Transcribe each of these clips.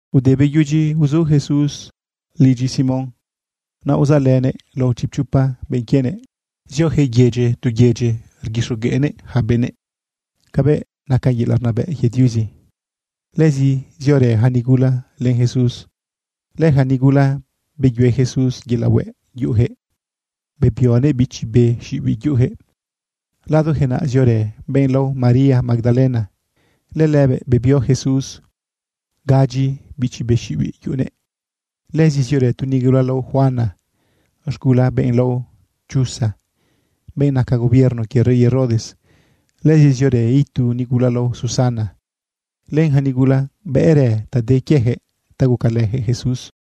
Ude beyudyi uzu Jesús lidyi Simón, naꞌ uzaꞌlënëꞌ lao chipchopa benꞌ quienëꞌ. Zioyaquëꞌ yedyi tu yedyi rguixogueꞌnëꞌ yaca benëꞌ cabëꞌ naca yelaꞌ rnabëꞌ quie Diuzi. Lëzi ziorë yaca nigula len Jesús. Lëyaca nigula beyue Jesús yelaꞌ hueꞌ yuꞌuyaquëꞌ, bebionëꞌ bichi be xiꞌibiꞌ yuꞌuyaquëꞌ. Ladoyaquëꞌ naꞌ ziorë benꞌ lao María Magdalena. Lëlëbëꞌ bebio Jesús gadyi bichi be xiꞌibiꞌ uyuꞌunëꞌ. Lëzi ziorë tu nigula lao Juana, z̃gula benꞌ lao Chuza, benꞌ naca gobierno quie rey Herodes. Lëzi ziorë itu nigula lao Susana, len yaca nigula bëꞌrë ta de quieyaquëꞌ ta gucalëyaquëꞌ Jesús.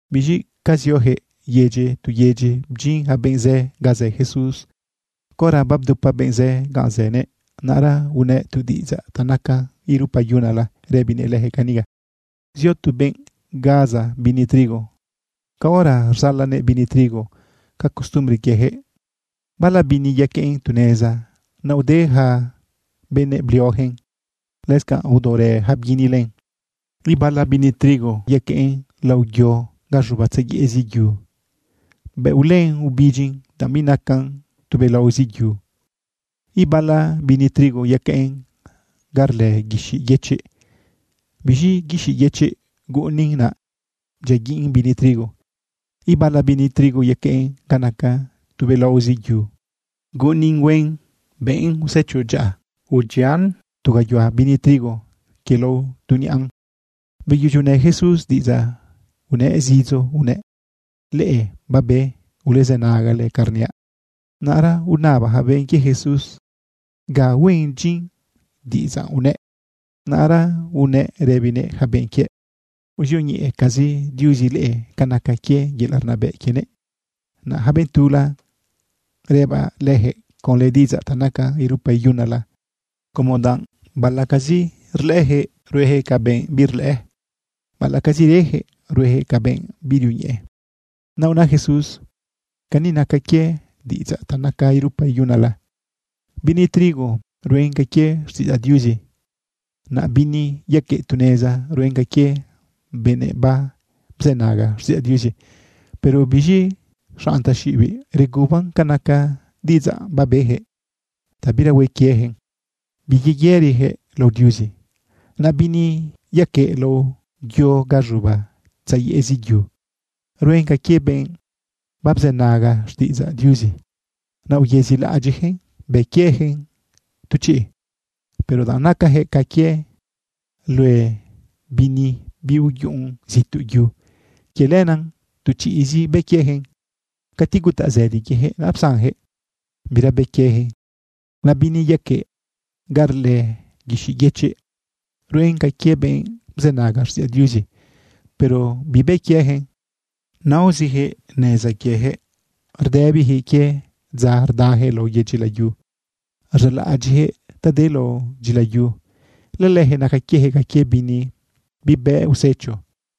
Biz̃i ca zioyaquëꞌ yedyi tu yedyi bdyin yaca benꞌ zë ga zë Jesús. Caora babdupa benꞌ zë ganꞌ zënëꞌ, naꞌra unëꞌ tu diꞌidzaꞌ ta nacan irupa iyunala rëbinëꞌ leyaquëꞌ cani: ―Zio tu benꞌ gaza bini trigo. Caora rzalanëꞌ bini trigo ca costumbre quieyaquëꞌ, bala bini yaqueꞌn tu neza, naꞌ ude ja benëꞌ bliojëꞌn, lëscanꞌ aodaorë yaca bguini len. Ibala bini trigo yaqueꞌn lao yo ga z̃uba tzayeꞌzi yu. Bëꞌ ulën ubidyin, danꞌ binacan tubelaozi yu. Ibala bini trigo yaqueꞌn ga rlë guixiꞌ yëchiꞌ. Biz̃i guixiꞌ yëchiꞌ guꞌunin, naꞌ bdyiaguiꞌn bini trigo. Ibala bini trigo yaqueꞌn ga naca tubelaozi yu. Guꞌunin huen bëꞌn usecho dyaꞌa. Udyian tu gayuhua bini trigo quie lao tu niꞌan. Beyudyi unë Jesús diꞌidzaꞌ unëꞌ zidzo unëꞌ: ―Leꞌe babe, ulezë nagale canꞌ rniaꞌ. Naꞌra unaba yaca benꞌ quie Jesús ga huen dyin diꞌidzaꞌ unëꞌ. Naꞌra unëꞌ rëbinëꞌ yaca benꞌ quiëꞌ: ―Uzioñeꞌecazi Diuzi leꞌe ca naca quie yelaꞌ rnabëꞌ quienëꞌ. Naꞌ yaca benꞌ tula, rëbaꞌ leyaquëꞌ conlë diꞌidzaꞌ ta nacan irupa iyunala como danꞌ baꞌalaꞌcazi rlëꞌëyaquëꞌ, rueyaquëꞌ ca benꞌ birlëꞌë, baꞌalaꞌcazi reyaquëꞌ, rueyaquëꞌ ca benꞌ birioñeꞌe. Naꞌ una Jesús: Cani naca quie diꞌidzaꞌ ta nacan irupa iyunala: Bini trigo ruen ca quie xtiꞌidzaꞌ Diuzi. Naꞌ bini yaqueꞌ tu neza, ruen ca quie benëꞌ babzënaga xtiꞌidzaꞌ Diuzi, pero biz̃i zaꞌ xanꞌ taxiꞌibiꞌ reguban ca naca diꞌidzaꞌ babeyaquëꞌ ta bira hue quieyaquëꞌn, biyeyëriyaquëꞌ lao Diuzi. Naꞌ bini yaqueꞌ lao yo ga z̃uba tzayeꞌzi yu, ruen ca quie benꞌ babzënaga xtiꞌidzaꞌ Diuzi, naꞌ uyezilaꞌadyiꞌyaquëꞌn bë quieyaquëꞌn tu chiꞌ. Pero danꞌ nacayaquëꞌ ca quie lue bini biuyuꞌun zituꞌ yu, quie lenaꞌ tu chiꞌzi bë quieyaquëꞌn. Cati gutaꞌ zëdi quieyaquëꞌ, naꞌ psanyaquëꞌ, bira bë quieyaquëꞌn. Naꞌ bini yaqueꞌ ga rlë guixiꞌ yëchiꞌ, ruen ca quie benꞌ bzënaga xtiꞌidzaꞌ Diuzi, pero bibë quieyaquëꞌn. Naoziyaquëꞌ neza quieyaquëꞌ, rdëbiyaquëꞌ quie dza rdayaquëꞌ lao yedyi layu, rzaꞌlaꞌadyiꞌyaquëꞌ ta de lao dyilayu. Lëlëyaquëꞌ naca quieyaquëꞌ ca quie bini bibëꞌ usecho.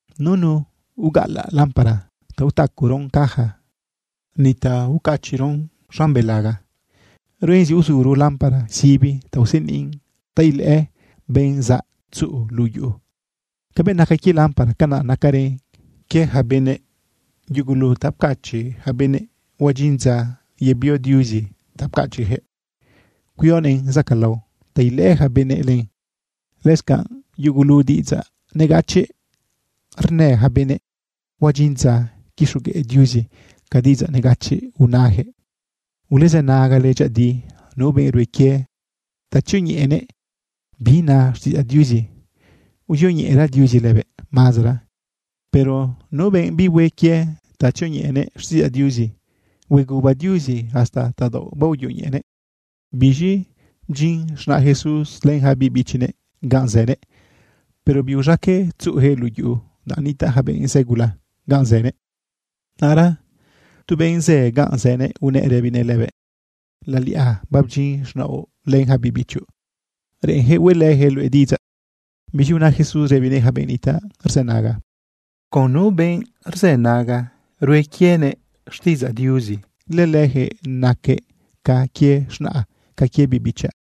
―Nunu ugaꞌalaꞌ lámpara ta utacoron caja, ni ta ucachiꞌron z̃an belaga. Ruen zi uzuro lámpara sibi ta useniꞌn ta ilëꞌë benꞌ zaꞌ tzuꞌu luꞌu yuꞌu. Cabëꞌ naca quie lámpara, canaꞌ nacarën quie yaca benëꞌ. Yugulu ta pcachiꞌ yaca benëꞌ, huadyin dza yebio Diuzi ta pcachiꞌyaquëꞌ, cuionëꞌn zacaꞌlao ta ilëꞌë ja benëꞌ len. Lëscanꞌ yugulu diꞌidzaꞌ negachiꞌ rnë yaca benëꞌ, huadyin dza quixogueꞌ Diuzi ca diꞌidzaꞌ negachiꞌ unayaquëꞌ. ’Ulezë nagale dyëꞌëdi. Nu benꞌ rue quie ta tzioñeꞌenëꞌ bi na xtiꞌidzaꞌ Diuzi, uzioñeꞌera Diuzi lëbëꞌ mazara, pero nu benꞌ bihue quie ta tzioñeꞌenëꞌ xtiꞌidzaꞌ Diuzi, hueguba Diuzi hasta tadaoꞌ baoyoñeꞌenëꞌ. Biz̃i bdyin z̃naꞌ Jesús len yaca biꞌ bichinëꞌ ganꞌ zënëꞌ, pero biuz̃aqueꞌ tzuꞌuyaquëꞌ luꞌu yuꞌu danꞌ nitaꞌ yaca benꞌ zë gula ganꞌ zënëꞌ. Naꞌra tu benꞌ zë ganꞌ zënëꞌ unëꞌ rëbinëꞌ lëbëꞌ: ―Laliꞌa babdyin z̃naoꞌ len yaca biꞌ bichoꞌ. Reꞌenyaquëꞌ hueꞌlëyaquëꞌ luëꞌ diꞌidzaꞌ. Biz̃i una Jesús rëbinëꞌ yaca benꞌ nitaꞌ rzënaga: ―Con nu benꞌ rzënaga rue quienëꞌ xtiꞌidzaꞌ Diuzi, lëleyaquëꞌ naquëꞌ ca quie z̃naꞌa, ca quie biꞌ bichaꞌ.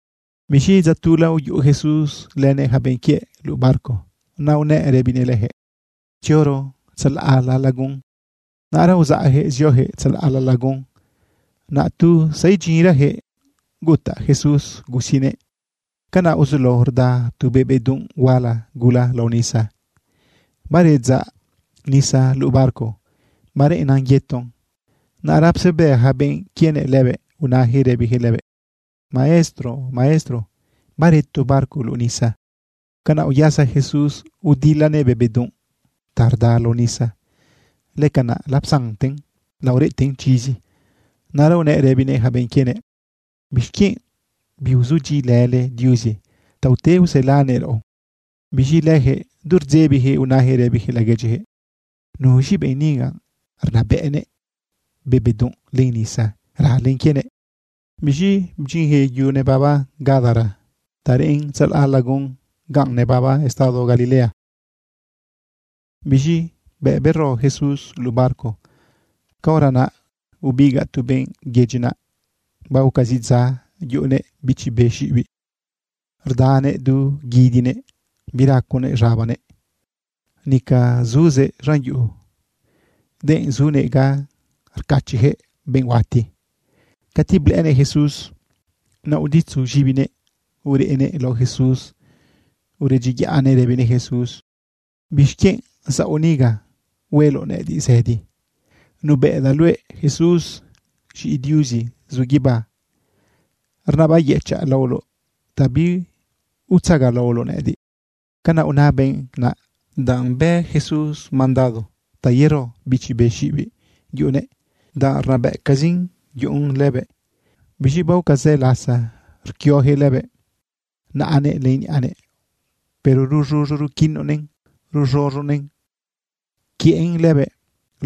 Biz̃i dza tula uyuꞌu Jesús lënëꞌ yaca benꞌ quiëꞌ luꞌu barco, naꞌ unëꞌ rëbinëꞌ leyaquëꞌ: ―Tzioro tzalaꞌla lagun. Naꞌra uzaꞌyaquëꞌ zioyaquëꞌ tzalaꞌla lagun. Naꞌ tu zaidyinrayaquëꞌ gutaꞌ Jesús gusinëꞌ. Canaꞌ uzulao rda tu be bedunꞌ huala gula lao nisa, baredzaꞌ nisa luꞌu barco bareꞌennan yeton. Naꞌra psebë yaca benꞌ quienëꞌ lëbëꞌ, unayaquëꞌ rëbiyaquëꞌ lëbëꞌ: ―¡Maestro! ¡Maestro! ¡Bareto barco luꞌu nisa! Canaꞌ uyasa Jesús udilanëꞌ be bedunꞌ ta rda lao nisa. Lëcanaꞌ lapsanten laoreꞌten chizi. Naꞌra unëꞌ rëbinëꞌ yaca benꞌ quienëꞌ: ―¿Bixquienꞌ biuzudyiꞌilële Diuzi ta ute uselanëꞌ raꞌo? Biz̃i leyaquëꞌ du rdzebiyaquëꞌ, unayaquëꞌ rëbiyaquëꞌ laguedyiyaquëꞌ: ―¿Nuz̃i benꞌ niga rnabëꞌnëꞌ be bedunꞌ len nisa ralen quienëꞌ? Biz̃i bdyinyaquëꞌ yu nebaba Gadara ta reꞌn tzalaꞌ lagun ganꞌ nebaba estado Galilea. Biz̃i bëꞌ bero Jesús luꞌu barco, caora naꞌ ubigaꞌ tu benꞌ yedyi naꞌ. Baoca zi dza yuꞌunëꞌ bichi be xiꞌibiꞌ. Rdanëꞌ du guidinëꞌ, biraconëꞌ z̃abanëꞌ. Nica zuzëꞌ z̃an yuꞌu, denꞌ zunëꞌ ga rcachiꞌyaquëꞌ benꞌ huati. Cati blëꞌënëꞌ Jesús, naꞌ uditzu z̃ibinëꞌ ureꞌnëꞌ lao Jesús uredyiyaꞌnëꞌ rëbinëꞌ Jesús: ―¿Bixquienꞌ zaoꞌ niga hueloꞌ nëꞌëdiꞌ zëdi? Nubëꞌdaꞌ luëꞌ Jesús, z̃iꞌi Diuzi zu guibá. Rnabayëchaꞌ laoloꞌ ta biutzagalaoloꞌ nëꞌëdiꞌ. Canaꞌ una benꞌ naꞌ danꞌ bë Jesús mandado ta yero bichi be xiꞌibiꞌ yuꞌunëꞌ, danꞌ rnabëꞌcazin yuꞌun lëbëꞌ. Biz̃i baoca zë lasa rquioyaquëꞌ lëbëꞌ naꞌanëꞌ len niꞌanëꞌ, pero ruz̃uz̃u ruquinonëꞌn, rz̃unonëꞌ rquiëꞌn lëbëꞌ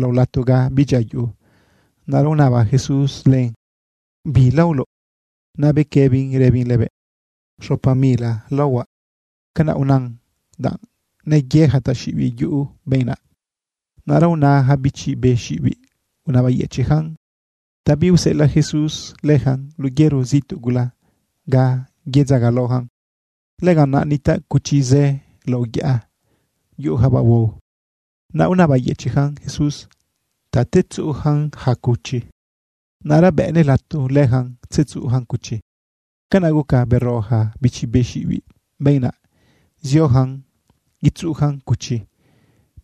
lao lato ga bidyia yuꞌu. Naꞌra unaba Jesús len: ―¿Bi laoloꞌ? Naꞌ bequëbin rëbin lëbëꞌ: ―Xopa mila laohuaꞌ. Canaꞌ unan danꞌ neyë yaca taxiꞌibiꞌ uyuꞌu benꞌ naꞌ. Naꞌra una yaca bichi be xiꞌibiꞌ unabayëchiꞌyacan ta biuseꞌelaꞌ Jesús leyacan luꞌu yero zituꞌ gula ga yedzagalaoyacan. Lëganꞌ naꞌ nitaꞌ cuchi zë lao yaꞌa yuꞌuyacabaꞌ huao. Naꞌ unabayëchiꞌyacan Jesús ta tzetzuꞌuyacan yaca cuchi. Naꞌra bëꞌnëꞌ lato leyacan tzetzuꞌuyacan cuchi. Canaꞌ guca bero yaca bichi be xiꞌibiꞌ benꞌ naꞌ, zioyacan yetzuꞌuyacan cuchi.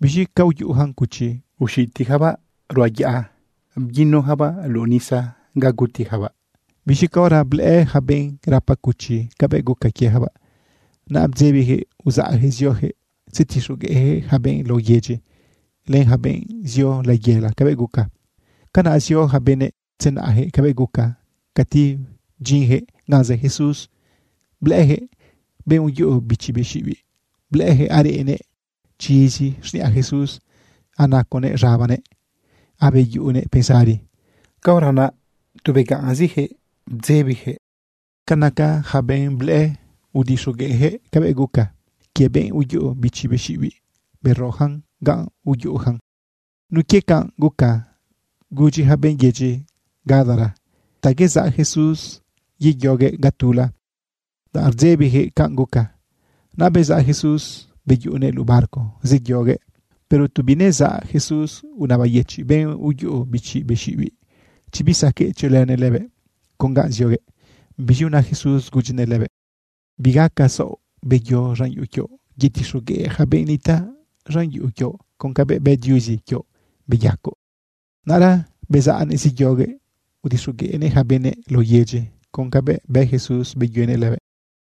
Biz̃i ca uyuꞌuyacan cuchi, uxitiyacabaꞌ luꞌu barranca bguinuyacabaꞌ luꞌu nisa ga gutiyacabaꞌ. Biz̃i caora blëꞌë yaca benꞌ rapa cuchi cabëꞌ guca quieyacabaꞌ, naꞌ bdzebiyaquëꞌ uzaꞌyaquëꞌ zioyaquëꞌ tzetixogueꞌyaquëꞌ yaca benꞌ lao yedyi len yaca benꞌ zio layela cabëꞌ guca. Canaꞌ zio yaca benëꞌ tzenaꞌyaquëꞌ cabëꞌ guca. Cati bdyinyaquëꞌ ganꞌ zë Jesús, blëꞌëyaquëꞌ benꞌ uyuꞌu bichi be xiꞌibiꞌ. Blëꞌëyaquëꞌ areꞌnëꞌ chizi xniꞌa Jesús, anaconëꞌ z̃abanëꞌ, abeyuꞌunëꞌ pensari. Caora naꞌ, tu begaꞌnziyaquëꞌ bdzebiyaquëꞌ. Ca naca yaca benꞌ blëꞌë, udixogueꞌyaquëꞌ cabëꞌ guca quie benꞌ uyuꞌu bichi be xiꞌibiꞌ beroyacan ganꞌ uyuꞌuyacan. Nun quie canꞌ guca, gudyi yaca benꞌ yedyi Gadara ta yezaꞌ Jesús yeyoguëꞌ ga tula, danꞌ rdzebiyaquëꞌ canꞌ guca. Naꞌ bezaꞌ Jesús beyuꞌunëꞌ luꞌu barco zeyoguëꞌ. Pero tu binezaꞌ Jesús, unabayëchiꞌ benꞌ uyuꞌu bichi be xiꞌibiꞌ chi bisaqueꞌ tziolënëꞌ lëbëꞌ con ga zioguëꞌ. Biz̃i una Jesús gudyinëꞌ lëbëꞌ: ―Bigaca saoꞌ. Beyo z̃an yuꞌu quioꞌ, yetixogueꞌ yaca benꞌ nitaꞌ z̃an yuꞌu quioꞌ con cabëꞌ bë Diuzi quioꞌ beyacoꞌ. Naꞌra bezaꞌnëꞌ zeyoguëꞌ udixogueꞌnëꞌ yaca benëꞌ lao yedyi con cabëꞌ bë Jesús beyuenëꞌ lëbëꞌ.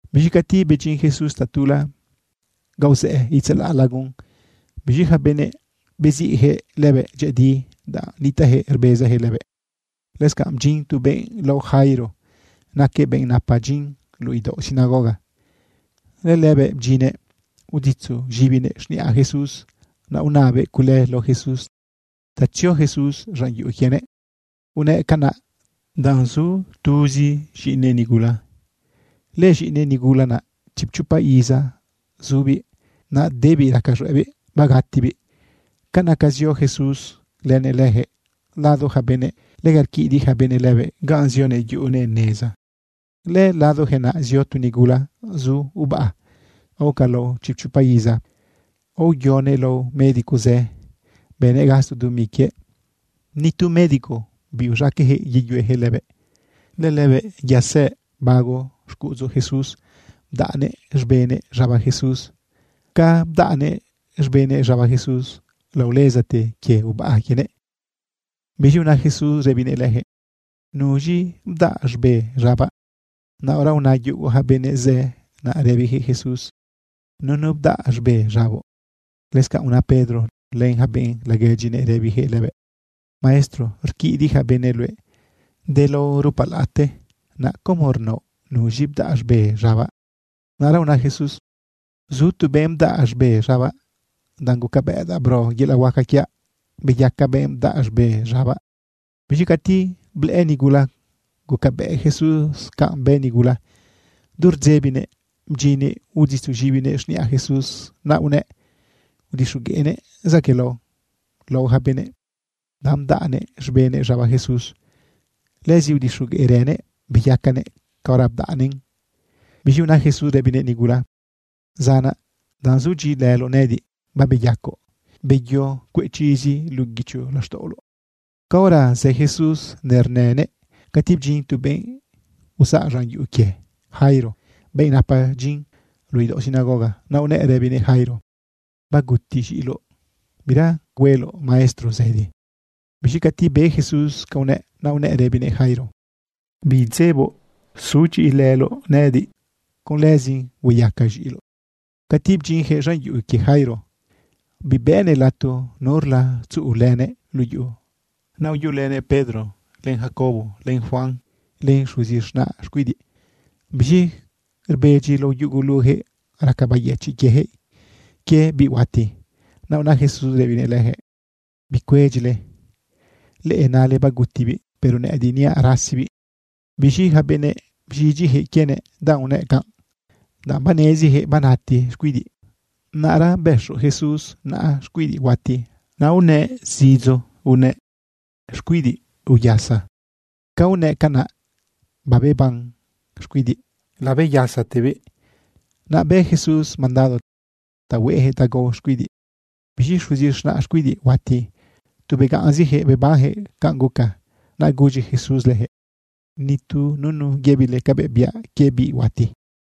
Biz̃i cati bedyin Jesús tatula ga uzëꞌë itzalaꞌ lagun, biz̃i yaca benëꞌ beziꞌyaquëꞌ lëbëꞌ dyëꞌëdi danꞌ nitaꞌyaquëꞌ rbezayaquëꞌ lëbëꞌ. Lëscanꞌ bdyin tu benꞌ lao Jairo, naquëꞌ benꞌ napa dyin luꞌu idaoꞌ sinagoga. Lëlëbëꞌ bdyinnëꞌ uditzu z̃ibinëꞌ z̃niꞌa Jesús. Naꞌ unabëꞌ cule lao Jesús ta tzio Jesús z̃an yuꞌu quienëꞌ. Unëꞌ canaꞌ danꞌ zu tuzi z̃iꞌinëꞌ nigula. Lëz̃iꞌinëꞌ nigula naꞌ chipchopa iza zubiꞌ, naꞌ debiꞌ raca z̃hueꞌbiꞌ bagatibiꞌ. Ca naca zio Jesús lënëꞌ leyaquëꞌ lado yaca benëꞌ, lega rquidiꞌ yaca benëꞌ lëbëꞌ ganꞌ zionëꞌ yuꞌunëꞌ neza. Lëladoyaquëꞌ naꞌ zio tu nigula zu ubaꞌa aoca lao chipchopa iza. Aoyonëꞌ lao médico zë, bënëꞌ gasto dumi quiëꞌ. Ni tu médico biuz̃aqueꞌyaquëꞌ yeyueyaquëꞌ lëbëꞌ. Lëlëbëꞌ yasëꞌ bago xcuꞌudzu Jesús bdaꞌnëꞌ z̃benëꞌ z̃aba Jesús. Ca bdaꞌnëꞌ z̃benëꞌ z̃aba Jesús, laolezate quie ubaꞌa quienëꞌ. Biz̃i una Jesús rëbinëꞌ leyaquëꞌ: ―¿Nuz̃i bdaꞌ z̃be z̃abaꞌ? Naꞌra una yugo yaca benëꞌ zë naꞌ rëbiyaquëꞌ Jesús: ―Nunu bdaꞌ z̃be z̃aboꞌ. Lëscanꞌ una Pedro len yaca benꞌ laguedyinëꞌ, rëbiyaquëꞌ lëbëꞌ: ―Maestro, rquidiꞌ yaca benëꞌ luëꞌ de lao rupalaꞌate, naꞌ como rnaoꞌ: “¿Nuz̃i bdaꞌ z̃be z̃abaꞌ?” Naꞌra una Jesús: ―Zu tu benꞌ bdaꞌ z̃be z̃abaꞌ, danꞌ gucabëꞌdaꞌ bro yelaꞌ huaca quiaꞌ beyaca benꞌ bdaꞌ z̃be z̃abaꞌ. Biz̃i cati blëꞌë nigula gucabëꞌ Jesús canꞌ bë nigula, du rdzebinëꞌ bdyinnëꞌ uditzu z̃ibinëꞌ z̃niꞌa Jesús. Naꞌ unëꞌ udixogueꞌnëꞌ zaquëꞌlao lao yaca benëꞌ, danꞌ bdaꞌnëꞌ z̃benëꞌ z̃aba Jesús. Lëzi udixogueꞌrënëꞌ beyacanëꞌ caora bdaꞌnëꞌn. Biz̃i una Jesús rëbinëꞌ nigula: ―Zanaꞌ, danꞌ zudyiꞌilëloꞌ nëꞌëdiꞌ, babeyacoꞌ. Beyo, cueꞌ chizi luꞌu guicho laxtaꞌoloꞌ. Caora zë Jesús nernënëꞌ, cati bdyin tu benꞌ uzaꞌ z̃an yuꞌu quie Jairo, benꞌ napa dyin luꞌu idaoꞌ sinagoga. Naꞌ unëꞌ rëbinëꞌ Jairo: ―Baguti z̃iꞌiloꞌ. Bira cule hueloꞌ Maestro zëdi. Biz̃i cati be Jesús ca unëꞌ, naꞌ unëꞌ rëbinëꞌ Jairo: ―Biidzeboꞌ. Sudyiꞌilëloꞌ nëꞌëdiꞌ con lëzin hueyaca z̃iꞌiloꞌ. Cati bdyinyaquëꞌ z̃an yuꞌu quie Jairo, bibëꞌnëꞌ lato nurla tzuꞌulënëꞌ luꞌu yuꞌu. Naꞌ uyuꞌulënëꞌ Pedro, len Jacobo, len Juan, len xuzi z̃naꞌ xcuidiꞌ. Biz̃i rbedyi lao yuguluyaquëꞌ raca beyëchiꞌ quieyaquëꞌ quie biꞌ huati. Naꞌ una Jesús rëbinëꞌ leyaquëꞌ: ―Bicuedyile. Leꞌe nale bagutibiꞌ, pero nëꞌëdiꞌ niaꞌ rasizibiꞌ. Biz̃i yaca benëꞌ bz̃idyiyaquëꞌ quienëꞌ, danꞌ unëꞌ canꞌ, danꞌ baneziyaquëꞌ banati xcuidiꞌ. Naꞌra bëxo Jesús naꞌa xcuidiꞌ huati, naꞌ unëꞌ zidzo unëꞌ: ―Xcuidiꞌ, uyasa. Ca unëꞌ canaꞌ, babeban xcuidiꞌ labeyasatebiꞌ. Naꞌ bë Jesús mandado ta hueꞌyaquëꞌ ta gao xcuidiꞌ. Biz̃i xuzi z̃naꞌ xcuidiꞌ huati, tu begaꞌnziyaquëꞌ bebanyaquëꞌ canꞌ guca. Naꞌ gudyi Jesús leyaquëꞌ: ―Ni tu nunu yëbile cabëꞌ biaꞌ quie biꞌ huati.